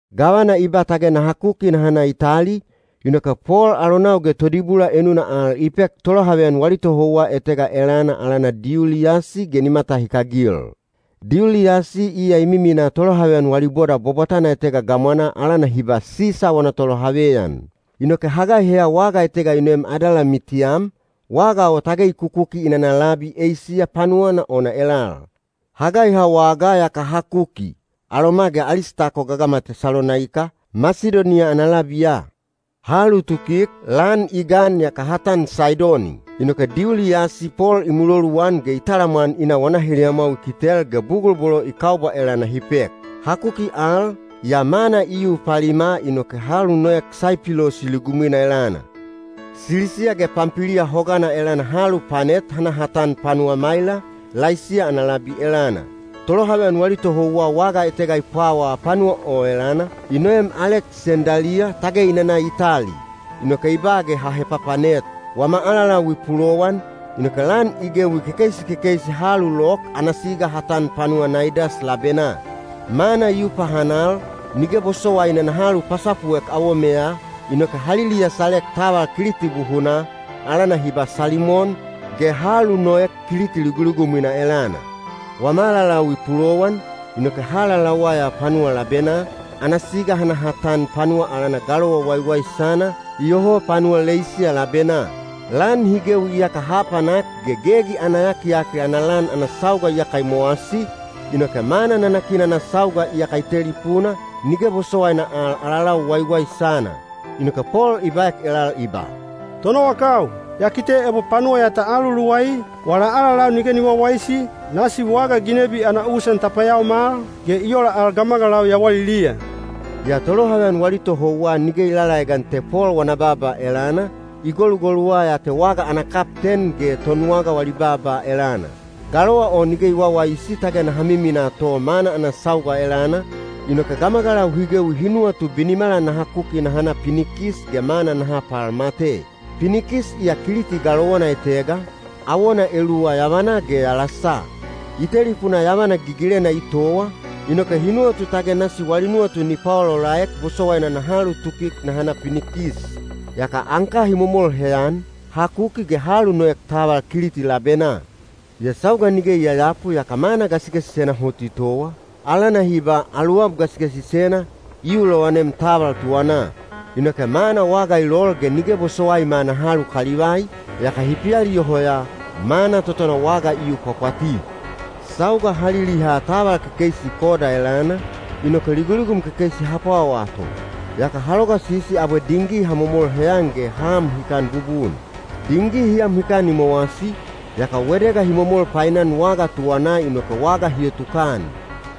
Gavana i ba tage naha kuki naha na Itali, inoke Pol alonau ge todibula enuna al i pek tolohaveyan wali tohouwa etega elana alana Diuliyasi ge ni matahikagil. Diuliyasi iya i miminaa tolohaveyan wali boda bwabwatana etega gamwanaa alana hi ba, “Sisa wana tolohaveyan.” Inoke ha gaiheya waga etega i noem Adalamitiyam, waga o tage i kukuki i nana labi Eisiya panuwana ona elal. Ha gaiha wagaa yaka ha kuki, aloma ge Alistako gagama Tesalonaika, Masidoniya ana labiya. Ha alutukik, lan i gan yaka ha tan Saidoni. Inoke Diuliyasi Pol i muloluan ge i talamwan i na wana heliyamwau i kitel ge bugul bolo i kaubwa elana hi pek. Ha kuki al, yaa mana i yu palima inoke ha alunoek Saipilosi ligumwina elana. Silisiya ge Pampiliya hogana elana ha alupanet ha na ha tan panuwa Maila, Laisiya ana labi elana. Tolohaveyan wali tohouwa waga etega i pwawaa panuwa o elana, i noem Aleksendaliya tage i nana Itali, inoke i ba ge ha hepapanet. Wama alalau i pulowan, inoke lan i gewi kekeisi kekeisi ha alulok ana siga ha tan panuwa Naidas labenaa. Mana i yu pahanal, nige bosowaina naha alupasapuek awomeya, inoke ha liliyasalek taval Kiliti buhunaa, alana hi ba Salimon, ge ha alunoek Kiliti liguligumwina elana. Wama alalau i pulowan, inoke ha alalauwa ya panuwa labenaa, ana siga ha na ha tan panuwa alana Galowa Waiwaisana, iyoho panuwa Leisiya labenaa. Lan hi gewi iyaka ha apanak ge Gegi ana Yakiyakil ana Lan ana sauga iyaka i mowasi, inoke mana nanakina ana sauga iyaka i telipuna, nige bosowaina al alalau waiwaisana. Inoke Pol i baek elal i ba, “Tonowakau, ya kite ebo panuwa ya ta aluluwai, wala alalau nige ni wawaisi, nasi waga ginebi ana usan ta payaomal, ge i ola al gamagalau yawaliliya.” Yaa tolohaveyan wali tohouwa nige i lalaegan te Pol wana baaba elana, i golugoluwa ya te waga ana kapten ge tonwaga wali baaba elana. Galowa o nige i wawaisi tage naha miminaa to mana ana sauga elana, inoke gamagalau hi gewi hi nuwatu binimala naha kuki naha na Pinikis ge mana naha palmate. Pinikis iya Kiliti galowana etega, awona eluwa yavanaa ge yalasa. I telipuna yavana gigilena i towa, inoke hi nuwatu tage nasi wali nuwatu ni paolaolaek bosowaina naha alutukik naha na Pinikis. Yaka anka hi momol heyan, ha kuki ge ha alunoek taval Kiliti labenaa. Yaa sauga nige i yayapu yaka mana gasigasisena hot i towa, alana hi ba “Aluwab Gasigasisena”, i yu lowanem taval tuwanaa. Inoke mana waga i lol ge nige bosowaima naha alukalivai, yaka hi pialiyoho ya, mana totona waga i yu pwapwati. Sauga ha liliha taval kekeisi Koda elana, inoke liguligum kekeisi ha pwawaa to. Yaka ha logasisi abwe dingi ha momol heyan ge ha am hikan bubun. Dingi hi am hikan i mowasi, yaka wedega hi momol painan waga tuwanaa inoke waga hi otukan.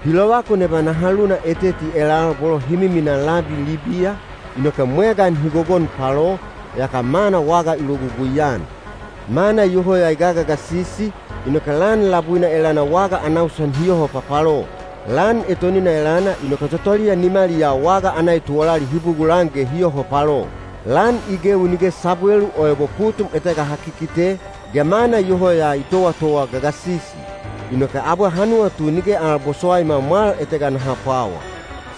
Hi lovakun eba naha luna eteti elal bolo hi miminaa labi Libiya, inoke mwegan hi gogon palo, yaka mana waga i logugui-an. Mana iyoho ya i gagagasisi, inoke lan labuina elana waga ana usan hi yoho papalo. Lan etonina elana inoke totoliya nimaliyaa waga ana etuwalali hi bugulan ge hi yoho palo. Lan i gewi nige sabwelu o ebo putum etega ha kikite, ge mana iyoho ya i towatowa gagasisi. Inoke abwe ha nuwatu nige al bosowaima mwal etega naha pwawa.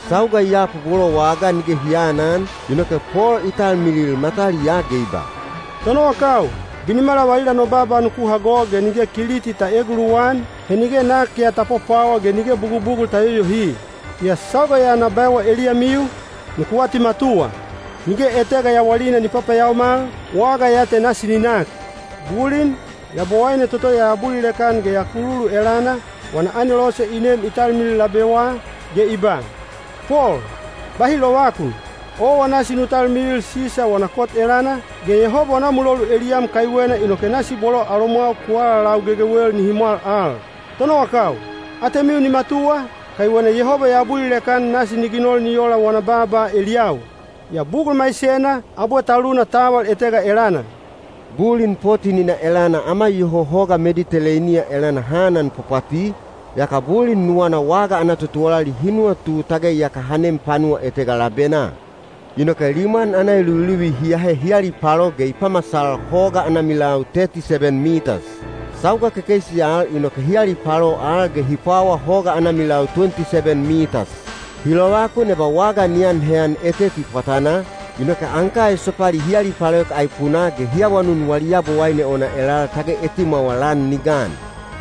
Sauga i yapu bolo wagaa nige hi aanan, inoke Pol i talmilil mataliyaa ge i ba, “Tonowakau, binimala valila no baaba nuku hago ge nige Kiliti ta eeguluwan, he nige nak ya ta pwapwawa ge nige bugubugul ta yoyohi. Yaa sauga ya na baewa eliyamiu, nuku atimatuwa! Nige etega yawalina ni papayaomal, waga ya te nasi ni nak. Bulin, Yabowaine toto ya abulilek-an ge ya kululu elana, wana anelose i nem i talmilil labewa, ge i ba, ‘Pol, bahi lovakun! Owa nasi nu talmilil Sisa wana kot elana. Ge Yehoba wana mulolu eliyam kaiwena, inoke nasi bolo alomwau ku alalau gegewel nihi mwal al.’ Tonowakau, atemiu ni matuwa, kaiwena Yehoba ya abulilek-an nasi ni ginol ni ola wana baaba eliyau. Yaa bugul maisena, abwe ta luna taval etega elana.” Bulin potin-ina elana ama iyoho hoga Mediteleiniya elana ha ananpwapwati, yaka bulin nuwana waga ana totuwalali hi nuwatu tage iyaka ha nem panuwa etega labenaa. Inoke limwan ana eluviluvi hi ahe hi alipalo ge i pamasal hoga ana milau teti seben mitas. Sauga kekeisi al inoke hi alipalo al ge hi pwawa hoga ana milau tuwenti seben mitas. Hi lovakun eba waga ni an heyan eteti pwatanaa, inoke anka esopali hi alipaloek aipunaa ge hi awanun wali yabowaine ona elal tage etimwawa lan ni gan.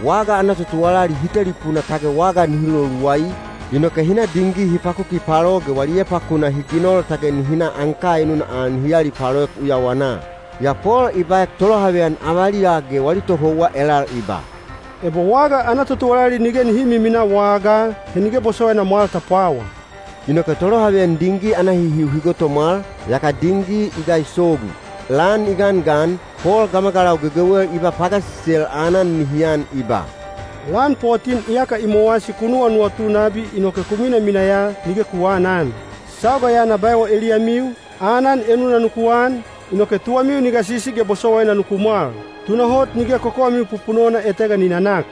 Waga ana totuwalali hi telipuna tage waga nihi loluwai, inoke hi na dingi hi pakuki palo ge wali epakuna hi ginol tage nihi na anka enuna al nihi alipaloek uyawanaa. Yaa Pol i baek tolohaveyan avaliya ge wali tohouwa elal i ba, “Ebo waga ana totuwalali nige nihi miminaa wagaa, he nige bosowaina mwal ta pwawa.” Inoke tolohaveyan dingi ana hihiu hi gotomwal, yaka dingi i gaisogu. Lan i gangan, Pol gamagalau gegewel i ba pagasisel aanan nihi an i ba, “Lan potin iyaka i mowasi ku nuwanuwatu nabi inoke ku minamina ya, nige ku aanan. Sauga ya na baewa eliyamiu, aanan enuna nuku an, inoke tuwamiu ni gasisi ge bosowaina nuku mwal. Tunahot nige kokowamiu pupunona etega ni nanak.”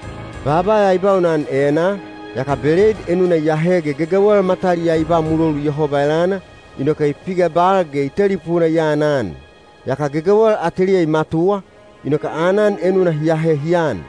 Baaba ya i baunan enaa, yaka beleid enuna i ahe ge gegewel mataliyaa i ba mulolu Yehoba elana, inoke i pigebal ge i telipuna i anan. Yaka gegewel ateliya i matuwa, inoke aanan enuna hi ahe hi an.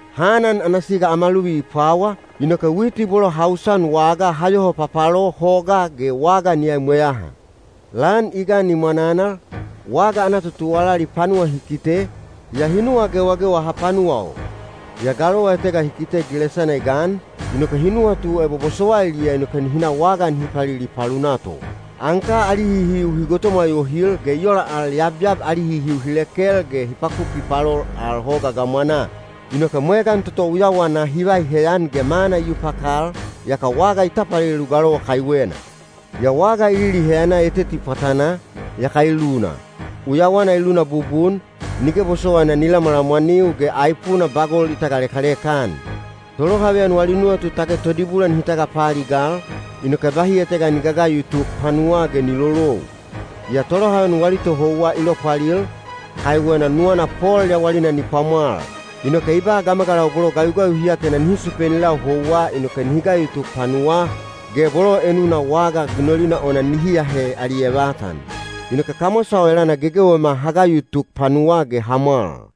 Ha anan ana siga ama luvi i pwawa, inoke witi bolo ha usan wagaa ha yoho papalo hogaa ge waga ni aimweyaha. Lan i gan i mwananal, waga ana totuwalali panuwa hi kite, yaa hi nuwa gewagewa hapanuwa o. Yaa galowa etega hi kite gilesana i gan, inoke hi nuwatu ebo bosowailiya inoke nihi na waga nihi palili palunaa to. Anka ali hihiu hi gotomwa yohil, ge i ola al yabyab ali hihiu hi lekel ge hi pakuki palol al hoga gamwanaa. Inoke mwegan toto uyawanaa hi vai heyan ge mana i yu pakal, yaka waga i tapalelu galowa kaiwena. Yaa waga i liliheyana eteti pwatanaa, yaka i luna. Uyawana i luna bubun, nige bosowaina ni lamwalamwaniu, ge aipuna bagol i tagalekaleka-an. Tolohaveyan wali nuwatu tage todibula nihi tagapaaligal, inoke bahi etega ni gagayu tuk panuwaa ge ni lolou. Yaa tolohaveyan wali tohouwa i lopwalil, kaiwena nuwana Pol yawalina ni pwamwal. Inoke i ba gamagalau bolo gayugayu hi atena nihi supeni lau houwa inoke nihi gayu tuk panuwaa, ge bolo enuna waga ginolina ona nihi ahe ali evatan. Inoke kamwasa o elana gegewema ha gayu tuk panuwaa ge ha mwal.